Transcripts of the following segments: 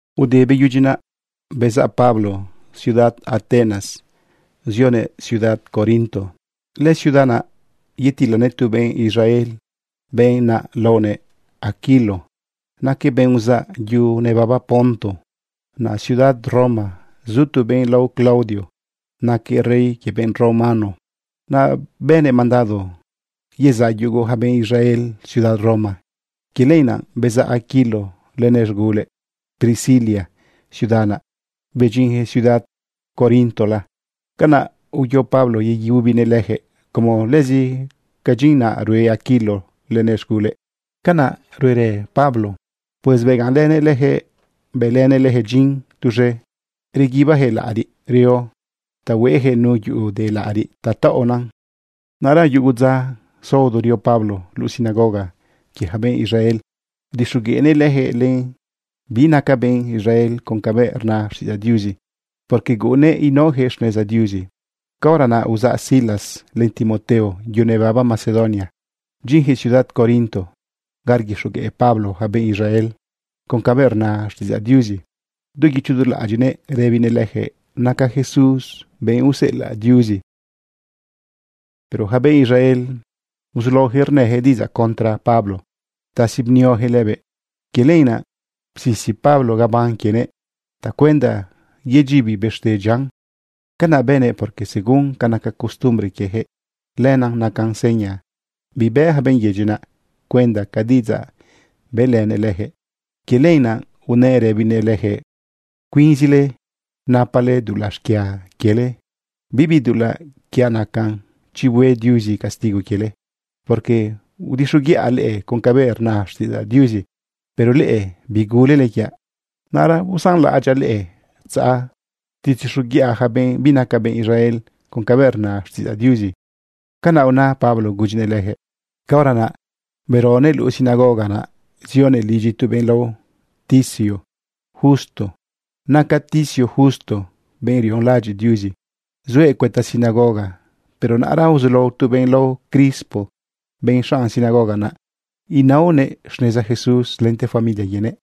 Ude beyudyi naꞌ, bezaꞌ Pablo ciudad Atenas zionëꞌ ciudad Corinto. Lëciudad naꞌ yatilanëꞌ tu benꞌ Israel. Benꞌ naꞌ laonëꞌ Aquilo, naquëꞌ benꞌ uzaꞌ yu nebaba Ponto. Naꞌ ciudad Roma zu tu benꞌ lao Claudio, naquëꞌ rey quie benꞌ romano. Naꞌ bënëꞌ mandado yezaꞌ yugu ja benꞌ Israel ciudad Roma. Quie lenaꞌ bezaꞌ Aquilo lenëꞌ z̃gulëꞌ Priscila ciudad naꞌ, bedyinyaquëꞌ ciudad Corintola. Canaꞌ uyo Pablo yeyubinëꞌ leyaquëꞌ como lëzi ca dyin naꞌ rue Aquilo lenëꞌ z̃gulëꞌ, canaꞌ ruerë Pablo. Pues begaꞌnlënëꞌ leyaquëꞌ bëlënëꞌ leyaquëꞌ dyin tuz̃e reguibiyaquëꞌ laꞌariꞌ reo ta hueyaquëꞌ nu yuꞌu de laꞌariꞌ ta taꞌona. Naꞌra yugo dza saodo rio Pablo luꞌu sinagoga quie ja benꞌ Israel udixogueꞌnëꞌ leyaquëꞌ len benꞌ binaca benꞌ Israel con cabëꞌ rna xtiꞌidzaꞌ Diuzi, porque guꞌunnëꞌ inaojëꞌ xneza Diuzi. Caora naꞌ uzaꞌ Silas len Timoteo yu nebaba Macedonia bdyinyaquëꞌ ciudad Corinto ga rguixogueꞌ Pablo ja benꞌ Israel con cabëꞌ rna xtiꞌidzaꞌ Diuzi du guicho du laꞌadyiꞌnëꞌ rëbinëꞌ leyaquëꞌ naca Jesús benꞌ useꞌelaꞌ Diuzi. Pero yaca benꞌ Israel, uzulaoyaquëꞌ rnëyaquëꞌ diꞌidzaꞌ contra Pablo ptasi bnioyaquëꞌ lëbëꞌ. Quie lenaꞌ psisi Pablo gabán quienëꞌ tacuenda yedyibi bëxte dyian. Canaꞌ bënëꞌ, porque según ca naca costumbre quieyaquëꞌ, lenaꞌ nacan seña bibë yaca benꞌ yedyi naꞌ cuenda ca diꞌidzaꞌ bëꞌlënëꞌ leyaquëꞌ. Quie lenaꞌ unëꞌ rëbinëꞌ lejëꞌ: ―Cuinzile napale dulaꞌ xquia quiele. Bibi dulaꞌ quiaꞌ nacan chi hue Diuzi castigo quiele, porque udixoguiꞌa leꞌe con cabëꞌ rna xtiꞌidzaꞌ Diuzi, pero leꞌe bigulele quiaꞌ. Naꞌra usanlaꞌadyaꞌ leꞌe tzaꞌ tzetixoguiꞌa yaca benꞌ binaca benꞌ Israel con cabëꞌ rna xtiꞌidzaꞌ Diuzi. ―Canaꞌ una Pablo gudyinëꞌ lejëꞌ. Caora naꞌ beronëꞌ luꞌu sinagoga naꞌ, zionëꞌ lidyi tu benꞌ lao Ticio Justo. Naca Ticio Justo benꞌ rionlaꞌadyiꞌ Diuzi, zuëꞌ cuëta sinagoga. Pero naꞌra uzulao tu benꞌ lao Crispo, benꞌ xanꞌ sinagoga naꞌ, inaonëꞌ xneza Jesús lente familia quienëꞌ.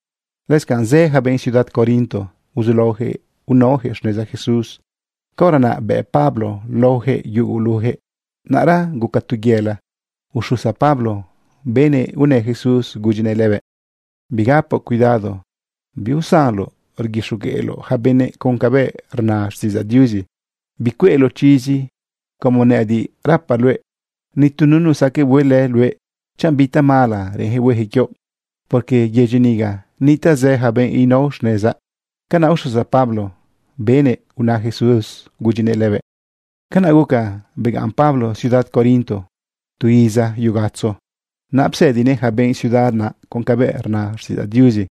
Lëscanꞌ zë yaca benꞌ ciudad Corinto, uzulaoyaquëꞌ inaoyaquëꞌ xneza Jesús. Caora naꞌ bëꞌ Pablo laoyaquëꞌ yuguluyaquëꞌ. Naꞌra guca tu yëla uxusa Pablo benëꞌ unë Jesús gudyinëꞌ lëbëꞌ: ―Bigapoꞌ cuidado. Biusanoꞌ rguixogueꞌloꞌ yaca benëꞌ con cabëꞌ rna xtiꞌidzaꞌ Diuzi. Bicueꞌloꞌ chizi. Como nëꞌëdiꞌ rapaꞌ luëꞌ, ni tu nunu saque huelë luëꞌ chanꞌ bi tamala reꞌenyaquëꞌ hueyaquëꞌ quioꞌ, porque yedyi niga nitaꞌ zë yaca benꞌ inao xnezaꞌ. ―Canaꞌ uxusa Pablo benëꞌ una Jesús gudyinëꞌ lëbëꞌ. Canaꞌ guca begaꞌn Pablo ciudad Corinto tu iza yu gatzo naꞌ psëdinëꞌ yaca benꞌ ciudad naꞌ con cabëꞌ rna xtiꞌidzaꞌ Diuzi.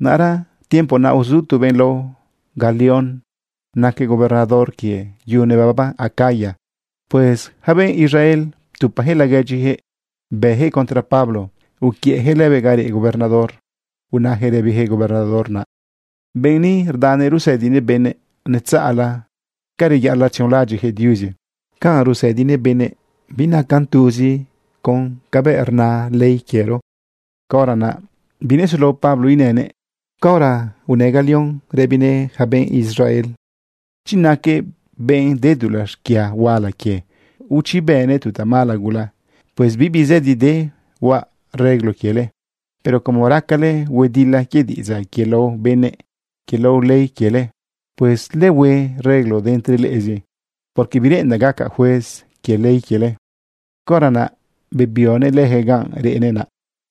Naꞌra tiempo naꞌ uzu tu benꞌ lao Galión. Naquëꞌ gobernador quie yu nebaba Acaya. Pues yaca benꞌ Israel ptupayaquëꞌ laguedyijëꞌ bëyaquëꞌ contra Pablo uquiëꞌyaquëꞌ lëbëꞌ ga reꞌ gobernador, unayaquëꞌ rëbiyaquëꞌ gobernador naꞌ: ―Benꞌ ni rdanëꞌ rusëdinëꞌ benëꞌ netzaꞌla ca reyaꞌalaꞌ tzionlaꞌadyiꞌyaquëꞌ Diuzi. Ca rusëdinëꞌ benëꞌ binacan tuzi con cabëꞌ rna ley quiero. Caora naꞌ binesulao Pablo inënëꞌ caora unë Galión rëbinëꞌ yaca benꞌ Israel: ―Chi naquëꞌ benꞌ de dulaꞌ xquia huala quie, o chi bënëꞌ tu tamala gula, pues bibi zëdi de huaꞌ reglo quiele. Pero como racale huedila quie diꞌidzaꞌ, quie lao benëꞌ, quie lao ley quiele, pues ulehue reglo de entre leꞌezi, porque bireꞌendaꞌ gacaꞌ juez quie ley quiele. Caora naꞌ bebionëꞌ leyaquëꞌ ganꞌ reꞌnëꞌ naꞌ.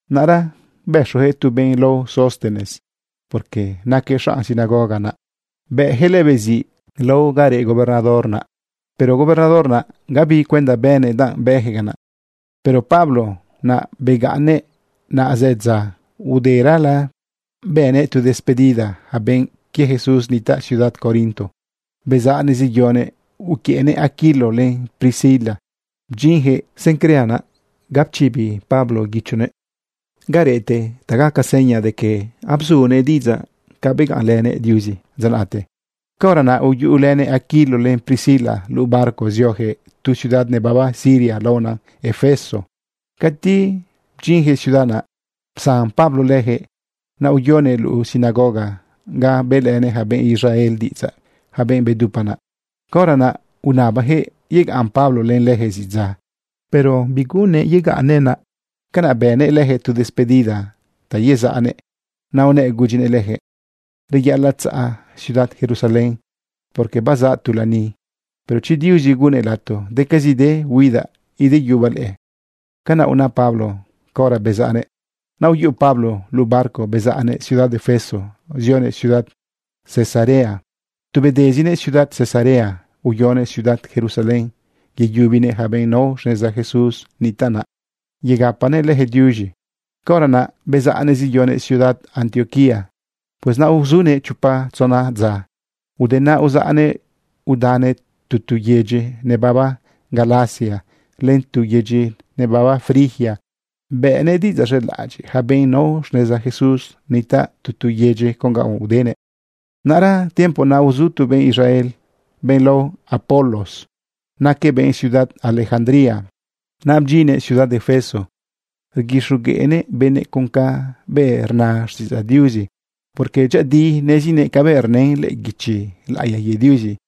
Naꞌra bëxoyaquëꞌ tu benꞌ lao Sóstenes, porque naquëꞌ xanꞌ sinagoga naꞌ, bëꞌyaquëꞌ lëbëꞌ ziꞌ lao ga reꞌ gobernador naꞌ. Pero gobernador naꞌ, gabi cuenda bënëꞌ danꞌ bëyaquëꞌ canaꞌ. Pero Pablo naꞌ begaꞌnnëꞌ naꞌ zë dza. Uderala bëꞌnëꞌ tu despedida yaca benꞌ quie Jesús nitaꞌ ciudad Corinto, bezaꞌnëꞌ zeyonëꞌ uquiëꞌnëꞌ Aquilo len Priscila bdyinyaquëꞌ Cencrea naꞌ ga pchibi Pablo guichonëꞌ garëꞌte ta gaca seña de que abzunëꞌ diꞌidzaꞌ ca begaꞌnlënëꞌ Diuzi dza naꞌte. Caora naꞌ uyuꞌulënëꞌ Aquilo len Priscila luꞌu barco zioyaquëꞌ tu ciudad nebaba Siria laona Efeso. Cati bdyinyaquëꞌ ciudad naꞌ, psan Pablo leyaquëꞌ naꞌ uyonëꞌ luꞌu sinagoga ga bëꞌlenëꞌ yaca benꞌ Israel diꞌidzaꞌ, yaca benꞌ bedupa naꞌ. Caora naꞌ unabayaquëꞌ yegaꞌn Pablo len leyaquëꞌ zidza, pero biguꞌunnëꞌ yegaꞌnnëꞌ naꞌ. Canaꞌ bëꞌnëꞌ leyaquëꞌ tu despedida ta yezaꞌnëꞌ, naꞌ unëꞌ gudyinëꞌ leyaquëꞌ: ―Reyaꞌalaꞌ tzaꞌa ciudad Jerusalén, porque bazaꞌ tu lani. Pero chi Diuzi gunnëꞌ lato decazide huidaꞌ ideyubaꞌ leꞌe. ―Canaꞌ una Pablo caora bezaꞌnëꞌ. Naꞌ uyuꞌu Pablo luꞌu barco bezaꞌnëꞌ ciudad Efeso zionëꞌ ciudad Cesarea. Tu bedezinëꞌ ciudad Cesarea uyonëꞌ ciudad Jerusalén yeyubinëꞌ yaca benꞌ nao xneza Jesús nitaꞌ naꞌ yegapanëꞌ lejëꞌ diuz̃i. Caora naꞌ bezaꞌnëꞌ zeyonëꞌ ciudad Antioquía. Pues naꞌ uzunëꞌ chopa tzona dza. Ude naꞌ, uzaꞌnëꞌ udanëꞌ tu tu yedyi nebaba Galacia len tu tu yedyi nebaba Frigia, bëꞌnëꞌ diꞌidzaꞌ z̃elaꞌadyiꞌ yaca benꞌ nao xneza Jesús nitaꞌ tu tu yedyi con ga udenëꞌ. Naꞌra tiempo naꞌ uzu tu benꞌ Israel, benꞌ lao Apolos. Naquëꞌ benꞌ ciudad Alejandría. Naꞌ bdyinnëꞌ ciudad Efeso rguixogueꞌnëꞌ benëꞌ con cabëꞌ rna xtiꞌidzaꞌ Diuzi, porque dyëꞌëdiꞌ nezinëꞌ cabëꞌ rnën lëꞌë guichi laꞌiya quie Diuzi.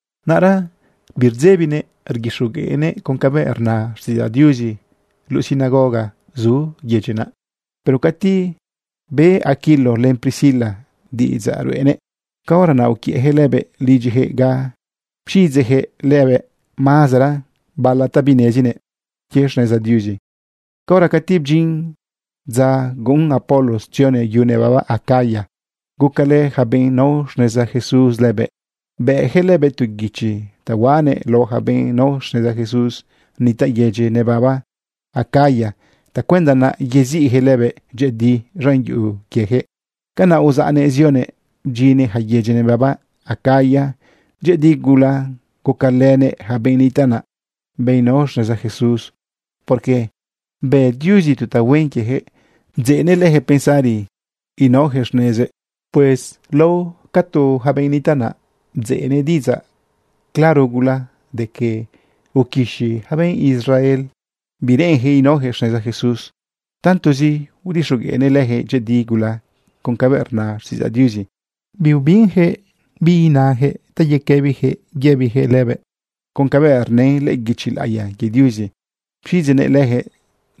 Naꞌra birdzebinëꞌ rguixogueꞌnëꞌ con cabëꞌ rna xtiꞌidzaꞌ Diuzi luꞌu sinagoga naꞌ zu yedyi naꞌ. Pero cati be Aquilo len Priscila diꞌidzaꞌ ruꞌenëꞌ, caora naꞌ uquiëꞌyaquëꞌ lëbëꞌ lidyiyaquëꞌ ga pxidzeꞌyaquëꞌ lëbëꞌ mazera bala ta binenezinëꞌ quie xneza Diuzi. Caora cati bdyin dza guꞌun Apolos tzionëꞌ yu nebaba Acaya, gucalë yaca benꞌ nao xneza Jesús lëbëꞌ, bëꞌyaquëꞌ lëbëꞌ tu guichi ta huaꞌnëꞌ lao yaca benꞌ nao xneza Jesús nitaꞌ yedyi nebaba Acaya tacuenda naꞌ yeziꞌyaquëꞌ lëbëꞌ dyëꞌëdi z̃an yuꞌu quieyaquëꞌ. Canaꞌ uzaꞌnëꞌ zionëꞌ bdyinnëꞌ ja yedyi nebaba Acaya. Dyëꞌëdi gula gucalënëꞌ ja benꞌ nitaꞌ naꞌ, benꞌ nao xneza Jesús, porque bë Diuzi tu tahuen quiejëꞌ bdzeꞌnëꞌ leyaquëꞌ pensari inaojëꞌ xnezëꞌ. Pues lao catu yaca benꞌ nitaꞌ naꞌ bdzeꞌnëꞌ diꞌidzaꞌ claro gula de que uquixi ja benꞌ Israel bireꞌenjëꞌ inaojëꞌ xneza Jesús. Tantozi udixogueꞌnëꞌ leyaquëꞌ dyëꞌëdi gula con cabëꞌ rna xtiꞌidzaꞌ Diuzi, biubinyaquëꞌ bi nayaquëꞌ ta yequëbiyaquëꞌ inayaquëꞌ lëbëꞌ. Con cabëꞌ rnën lëꞌë guichi laꞌiya quie Diuzi, pxiꞌidzeꞌnëꞌ leyaquëꞌ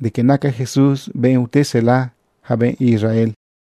de que naca Jesús benꞌ ute usela yaca benꞌ Israel.